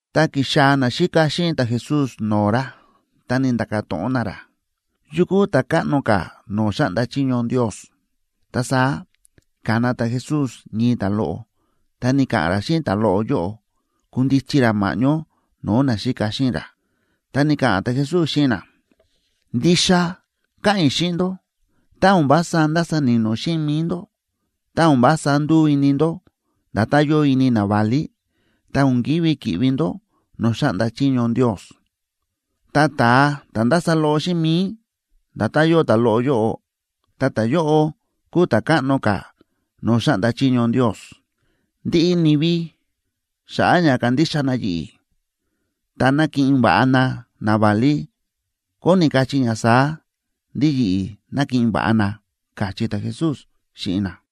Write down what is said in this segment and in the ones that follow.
Ta ki̱xaa̱ naxíka xíꞌin ta̱Jesús no̱o̱ ra, ta ni̱nda̱ka̱ to̱ꞌon na ra: ―¿Yu kúu ta̱káꞌno ka̱ no̱o̱ xáꞌnda chiño Ndios? Ta saá ka̱na ta̱Jesús ñii ta̱loꞌo, ta ni̱ka̱ꞌa̱n ra xíꞌin ta̱loꞌo yóꞌo kundichi ra ma̱ꞌñó no̱o̱ naxíka xíꞌin ra. Ta ni̱ka̱ꞌa̱n ta̱Jesús xíꞌin na: ―Ndixa káꞌa̱n i̱ xíꞌin ndó, tá o̱n vása ndasa ni̱no̱ xíꞌin mi̱i ndó, tá o̱n vása nduu ini ndó nda̱tán yóo ini naválí, ta o̱n ki̱ví ki̱ꞌvi ndó no̱o̱ xáꞌnda chiño Ndios. Ta ta̱a ta̱ ndása loꞌo xíꞌin mi̱i, nda̱tán yóo ta̱loꞌo yóꞌo, ta ta̱yóꞌo kúu ta̱káꞌno ka̱ no̱o̱ xáꞌnda chiño Ndios. Ndiꞌi ni̱vi xa̱ꞌa̱ ña kándixa na yi̱ꞌi̱, ta nákiꞌin va̱ꞌa na naválí, kóni kachí ña saá, ndí yi̱ꞌi̱ nákiꞌin va̱ꞌa na ―káchí ta̱Jesús xíꞌin na.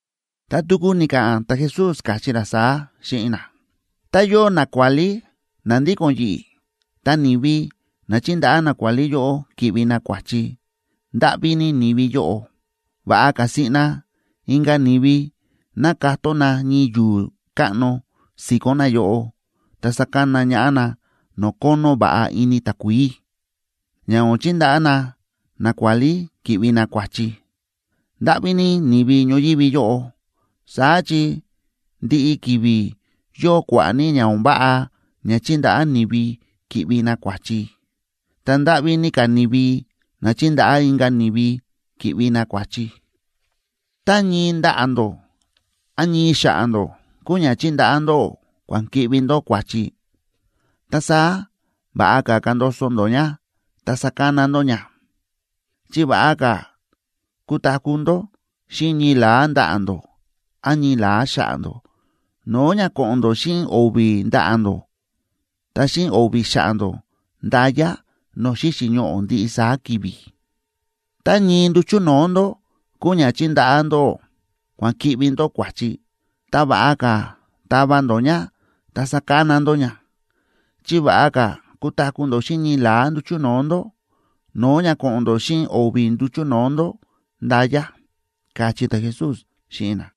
Ta tuku ni̱ka̱ꞌa̱n ta̱Jesús, káchí ra saá xíꞌin na: ―Tá yóo nakuálí na ndíko̱n yi̱ꞌi̱, ta ni̱vi na chíndaꞌá nakuálí yóꞌo ki̱ꞌvi na kua̱chi, ¡ndáꞌví ní ni̱vi yóꞌo! Va̱ꞌa ka̱ siꞌna inka̱ ni̱vi ná katón na ñii yu̱u̱ káꞌno si̱ko̱n nayóꞌo, ta sakana ñaꞌá na no̱o̱ kónó va̱ꞌa ini takuií, ña o̱n chindaꞌá na nakuálí ki̱ꞌvi na kua̱chi. ¡Ndáꞌví ní ni̱vi ñoyívi yóꞌo!, saá chi ndiꞌi ki̱vi̱ yóo kua̱ꞌa̱ ní ña o̱n váꞌa ña chíndaꞌá ni̱vi ki̱ꞌvi na kua̱chi. ¡Ta ndáꞌví ní ka̱ ni̱vi na chíndaꞌá inka̱ ni̱vi ki̱ꞌvi na kua̱chi! ’Tá ñii ndaꞌa̱ ndó án ñii xa̱ꞌa̱ ndó kúu ña chíndaꞌá ndóꞌó kua̱n ki̱ꞌvi ndó kua̱chi, ta saá va̱ꞌa ka̱ kandoso ndó ña ta sakana ndó ña. Chi va̱ꞌa ka̱ kutaku̱ ndó xíꞌin ñii la̱á ndaꞌa̱ ndó án ñii la̱á xa̱ꞌa̱ ndó, no̱o̱ ña ko̱ꞌo̱n ndó xíꞌin o̱vi̱ ndaꞌa̱ ndó ta xíꞌin o̱vi̱ xa̱ꞌa̱ ndó nda̱ya no̱o̱ xíxi̱ ñoꞌo̱ ndiꞌi saá ki̱vi̱. Tá ñii nduchu̱ no̱o̱ ndó kúu ña chíndaꞌá ndóꞌó kua̱n ki̱ꞌvi ndó kua̱chi, ta va̱ꞌa ka̱ tava ndó ña ta sakana ndó ña. Chi va̱ꞌa ka̱ kutaku̱ ndó xíꞌin ñii la̱á nduchu̱ no̱o̱ ndó, no̱o̱ ña ko̱ꞌo̱n ndó xíꞌin o̱vi̱ nduchu̱ no̱o̱ ndó nda̱ya ―káchí ta̱Jesús xíꞌin na.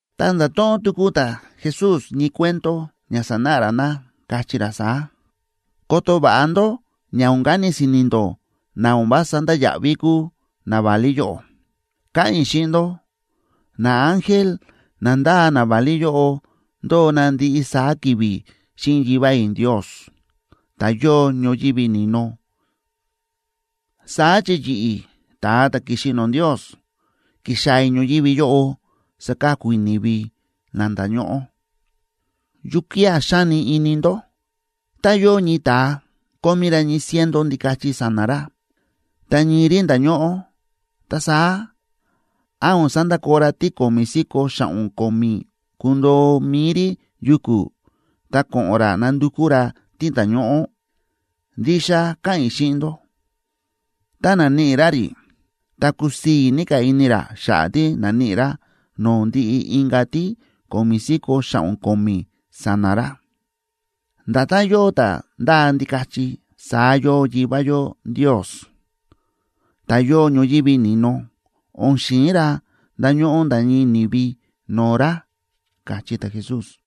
Ta nda̱to̱ꞌon tuku ta̱Jesús ñii cuento ña sanáꞌa ra na, káchí ra saá: ―Koto va̱ꞌa ndó ña o̱n kani si̱ni̱ ndó na o̱n vása ndáya̱ꞌví kúu naválí yóꞌo. Káꞌa̱n i̱ xíꞌin ndó, naángel na ndáa naválí yóꞌo ndóo na ndiꞌi saá ki̱vi̱ xíꞌin Yivá i̱ Ndios, ta̱ yóo ñoyívi ni̱no. Saá chi yi̱ꞌi̱, ta̱a ta̱ ki̱xi no̱o̱ Ndios, ki̱xaa̱ i̱ ñoyívi yóꞌo saka̱ku i̱ ni̱vi na nda̱ñóꞌó. ’¿Yukía̱ xáni ini ndó? Tá yóo ñii ta̱a kómí ra ñii ciento ndikachi sa̱na̱ ra, ta ñii rí nda̱ñóꞌó, ta saá, ¿án o̱n sandakoo ra tí ko̱mi̱ si̱ko̱ xa̱ꞌo̱n ko̱mi̱ kundoo mi̱i rí yuku̱, ta ko̱ꞌo̱n ra nandukú ra tí nda̱ñóꞌó? Ndixa káꞌa̱n i̱ xíꞌin ndó, tá naníꞌi ra rí, ta kusii̱ ní ka̱ ini ra xa̱ꞌa̱ tí na̱níꞌi ra no̱o̱ ndiꞌi inka̱ tí ko̱mi̱ si̱ko̱ xa̱ꞌo̱n ko̱mi̱ sa̱na̱ ra. Nda̱tán yóo ta̱ ndáa ndikachi, saá yóo Yivá yó Ndios, ta̱ yóo ñoyívi ni̱no. O̱n xi̱in ra ndañóꞌó nda̱ ñii ni̱vi no̱o̱ ra ―káchí ta̱Jesús.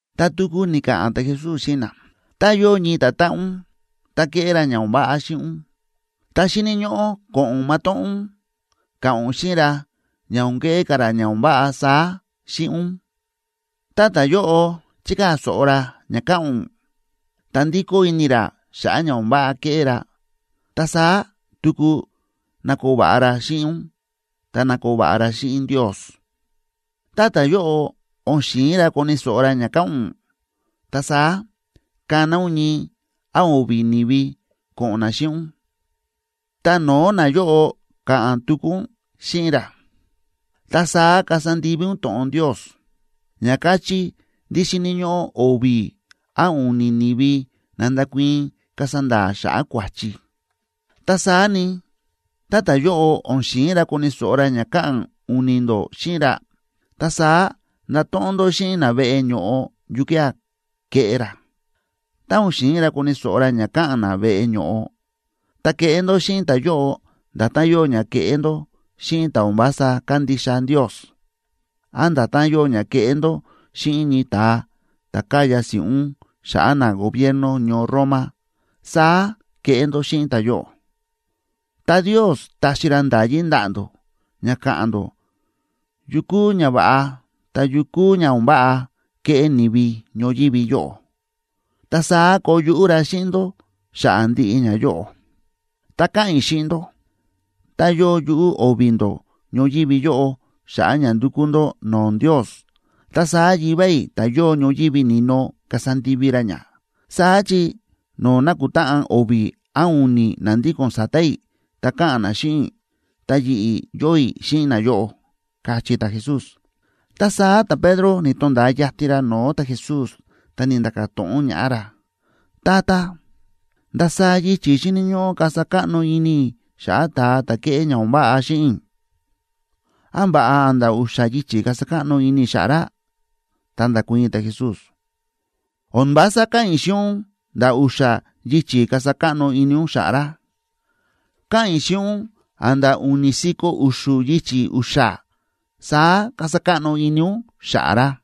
Ta tuku ni̱ka̱ꞌa̱n ta̱Jesús xíꞌin na: ―Tá yóo ñii ta̱táꞌan ún, ta ke̱ꞌé ra ña o̱n váꞌa xíꞌin ún, ta xíni̱ ñóꞌó ko̱ꞌo̱n matóꞌón ún ka̱ꞌa̱n ún xíꞌin ra ña o̱n keꞌé ka̱ ra ña o̱n váꞌa saá xíꞌin ún. Tá ta̱yóꞌo chikaa̱ so̱ꞌo ra ña káꞌa̱n ún, ta ndikó ini ra xa̱ꞌa̱ ña o̱n váꞌa ke̱ꞌé ra, ta saá tuku nakoo va̱ꞌa ra xíꞌin ún ta nakoo va̱ꞌa ra xíꞌin Ndios. Tá ta̱yóꞌo o̱n xi̱in ra koni̱ so̱ꞌo ra ña káꞌa̱n ún, ta saá kana ún ñii án o̱vi̱ ni̱vi ko̱ꞌo̱n na xíꞌin ún, ta no̱o̱ nayóꞌo ka̱ꞌa̱n tuku ún xíꞌin ra. Ta saá kasa ndivi ún to̱ꞌon Ndios, ña káchí ndí xíni̱ ñóꞌó o̱vi̱ án u̱ni̱ ni̱vi na ndakuii̱n kasa nda̱a̱ xa̱ꞌa̱ kua̱chi. Ta saá ni, tá ta̱yóꞌo o̱n xi̱in ra koni̱ so̱ꞌo ra ña káꞌa̱n u̱ni̱ ndó xíꞌin ra, ta saá ndato̱ꞌon ndó xíꞌin na veꞌe ño̱ꞌo yukía̱ ke̱ꞌé ra. Tá o̱n xi̱in ra koni̱ so̱ꞌo ra ña káꞌa̱n na veꞌe ño̱ꞌo, ta keꞌé ndó xíꞌin ta̱yóꞌo nda̱tán yóo ña kéꞌé ndó xíꞌin ta̱ o̱n vása kándixa Ndios, án nda̱tán yóo ña kéꞌé ndó xíꞌin ñii ta̱a ta̱ káya si̱ꞌún xa̱ꞌa̱ nagobierno ñoo Roma, saá keꞌé ndó xíꞌin ta̱yóꞌo. ’Ta Ndios taxi ra nda̱yí ndaꞌa̱ ndó ña ka̱ꞌa̱n ndó yu kúu ñava̱ꞌa ta yu kúu ña o̱n váꞌa keꞌé ni̱vi ñoyívi yóꞌo. Ta saá koo yuꞌú ra xíꞌin ndó xa̱ꞌa̱ ndiꞌi ñayóꞌo. ’Ta káꞌa̱n i̱ xíꞌin ndó, tá yóo yuꞌú o̱vi̱ ndó ñoyívi yóꞌo xa̱ꞌa̱ ña ndukú ndó no̱o̱ Ndios, ta saá Yivá i̱ ta̱ yóo ñoyívi ni̱no kasa ndivi ra ña. Saá chi no̱o̱ nákutáꞌan o̱vi̱ án u̱ni̱ na ndíko̱n sa̱ta̱ i̱ ta káꞌa̱n na xíꞌin i̱, ta yi̱ꞌi̱ yóo i̱ xíꞌin nayóꞌo ―káchí ta̱Jesús. Ta saá ta̱Pedro ni̱to̱nda̱a yatin ra no̱o̱ ta̱Jesús, ta ni̱nda̱ka̱ to̱ꞌon ñaꞌá ra: ―Tata, ¿ndasaá yichi̱ xíni̱ ñóꞌó kasa káꞌno ini i̱ xa̱ꞌa̱ ta̱a ta̱ kéꞌé ña o̱n váꞌa xíꞌin i̱? ¿Án va̱ꞌa a̱nda̱ u̱xa̱ yichi̱ kasa káꞌno ini i̱ xa̱ꞌa̱ ra? Ta nda̱kuii̱n ta̱Jesús: ―O̱n vása káꞌa̱n i̱ xíꞌin ún a̱nda̱ u̱xa̱ yichi̱ kasa káꞌno ini ún xa̱ꞌa̱ ra, káꞌa̱n i̱ xíꞌin ún a̱nda̱ u̱ni̱ si̱ko̱ u̱xu̱ yichi̱ u̱xa̱, saá kasa káꞌno ini ún xa̱ꞌa̱ ra.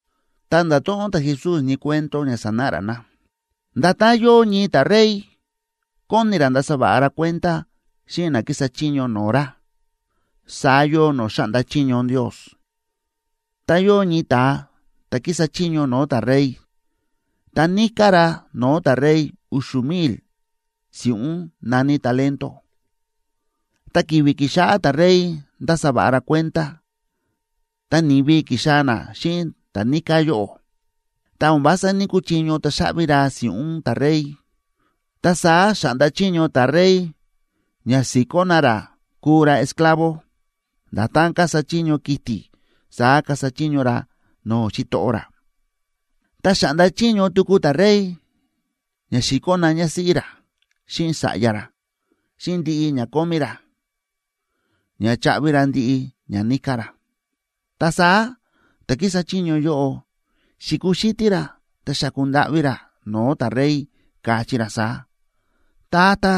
Ta nda̱to̱ꞌon ta̱Jesús ñii cuento ña sanáꞌa ra na: ―Nda̱tán yóo ñii ta̱rey kóni ra ndasa va̱ꞌa ra kuenda xíꞌin na kísa chiño no̱o̱ ra, saá yóo no̱o̱ xáꞌnda chiño Ndios. Ta yóo ñii ta̱a ta̱ kísa chiño no̱o̱ ta̱rey, ta níká ra no̱o̱ ta̱rey u̱xu̱ mil si̱ꞌún na̱ní talento.a Ta ki̱vi̱ ki̱xáꞌá ta̱rey ndása va̱ꞌa ra kuenda, ta ni̱vi ki̱xaa̱ na xíꞌin ta̱ níká yóꞌo. Ta o̱n vása ní‑kuchiño taxaꞌvi ra si̱ꞌún ta̱rey, ta saá xa̱ꞌnda chiño ta̱rey ña si̱kó na ra kuu ra esclavo, nda̱tán kasa chiño kiti̱ saá kasa chiño ra no̱o̱ xitoꞌo ra. Ta xa̱ꞌnda chiño tuku ta̱rey ña si̱kó na ñásíꞌí ra xíꞌin sa̱ꞌya ra, xíꞌin ndiꞌi ña kómí ra ña chaꞌvi ra ndiꞌi ña níká ra. Ta saá ta̱ kísa chiño yóꞌo xi̱kuxítí ra ta xa̱ku ndáꞌví ra no̱o̱ ta̱rey, káchí ra saá: “Tata,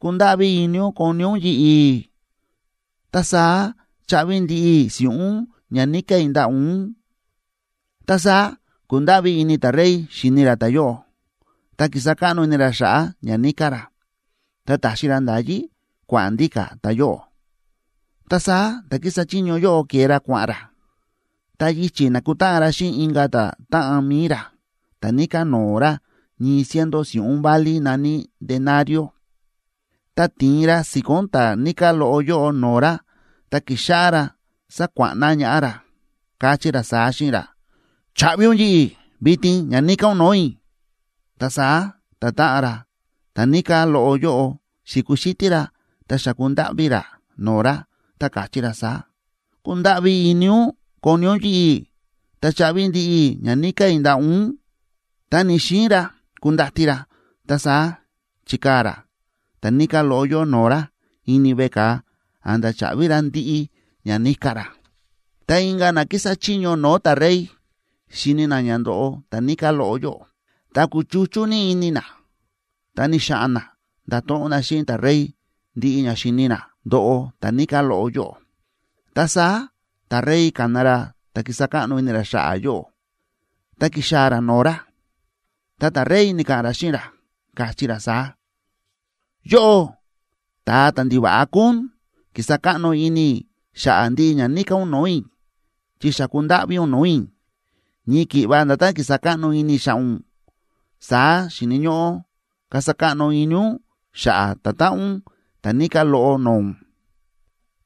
kundáꞌví ini ún koni ún yi̱ꞌi̱, ta saá chaꞌvi ndiꞌi i̱ si̱ꞌún ña níká i̱ ndaꞌa̱ ún.” Ta saá ku̱ndáꞌví ini ta̱rey xi̱ni ra ta̱yóꞌo, ta ki̱sa káꞌno ini ra xa̱ꞌa̱ ña níká ra, ta ta̱xi ra nda̱yí kua̱ꞌa̱n ndíka̱ ta̱yóꞌo. Ta saá ta̱ kísa chiño yóꞌo ke̱e ra kua̱ꞌa̱n ra, ta yichi̱ na̱kutáꞌan ra xíꞌin inka̱ ta̱táꞌan mi̱i ra ta̱ níká no̱o̱ ra ñii ciento si̱ꞌún válí na̱ní denario.b Ta ti̱in ra si̱ko̱n ta̱ níká loꞌo yóꞌo no̱o̱ ra ta ki̱xáꞌá ra sákuáꞌna ñaꞌá ra, káchí ra saá xíꞌin ra: “¡Chaꞌvi yi̱ꞌi̱ vitin ña níká ún no̱o̱ i̱!” Ta saá ta̱táꞌan ra ta̱ níká loꞌo yóꞌo xi̱kuxítí ra ta xa̱ku ndáꞌví ra no̱o̱ ra, ta káchí ra saá: “Kundáꞌví ini ún koni ún yi̱ꞌi̱, ta chaꞌvi ndiꞌi i̱ ña níká i̱ ndaꞌa̱ ún.” Ta ni̱‑xiin ra kundati ra. Ta saá chi̱kaa̱ ra ta̱ níká loꞌo yóꞌo no̱o̱ ra ini veꞌe ka̱a a̱nda̱ chaꞌvi ra ndiꞌi ña níká ra. Ta inka̱ na kísa chiño no̱o̱ ta̱rey xi̱ni na ña ndóꞌo ta̱ níká loꞌo, ta kúchuchú ní ini na, ta ni̱xa̱ꞌa̱n na nda̱to̱ꞌon na xíꞌin ta̱rey ndiꞌi ña xi̱ni na ndo̱ꞌo ta̱ níká loꞌo yóꞌo. Ta saá ta̱rey ka̱na ra ta̱ ki̱sa káꞌno ini ra xa̱ꞌa̱ yóꞌo, ta ki̱xaa̱ ra no̱o̱ ra, ta ta̱rey ni̱ka̱ꞌa̱n ra xíꞌin ra, káchí ra saá: “¡Yóꞌó ta̱a ndiva̱ꞌa kúu ún! Ki̱sa káꞌno ini i̱ xa̱ꞌa̱ ndiꞌi ña níká ún no̱o̱ i̱, chi xa̱ku ndáꞌví ún no̱o̱ i̱. Ñii ki̱ꞌva nda̱tán ki̱sa káꞌno ini i̱ xa̱ꞌa̱ ún, saá xíni̱ ñóꞌó kasa káꞌno ini ún xa̱ꞌa̱ ta̱táꞌan ún ta̱ níká loꞌo no̱o̱ ún.”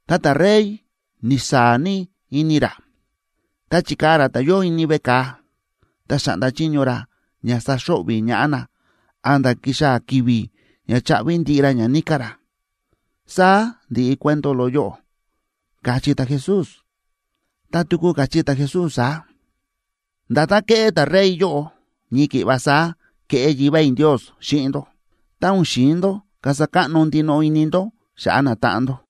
Ta ta̱rey ni̱saa̱ ní ini ra, ta chi̱kaa̱ ra ta̱yóꞌo ini veꞌe ka̱a, ta xa̱ꞌnda chiño ra ña saxo̱ꞌvi̱ ñaꞌá na a̱nda̱ kixaa̱ ki̱vi̱ ña chaꞌvi ndiꞌi ra ña níká ra. Saá ndi̱ꞌi cuento loꞌo yóꞌo ―káchí ta̱Jesús. Ta tuku káchí ta̱Jesús saá: ―Nda̱tán ke̱ꞌé ta̱rey yóꞌo, ñii ki̱ꞌva saá keꞌé Yivá i̱ Ndios xíꞌin ndó, tá o̱n xi̱in ndó kasa káꞌno ndinoꞌo ini ndó xa̱ꞌa̱ natáꞌan ndó.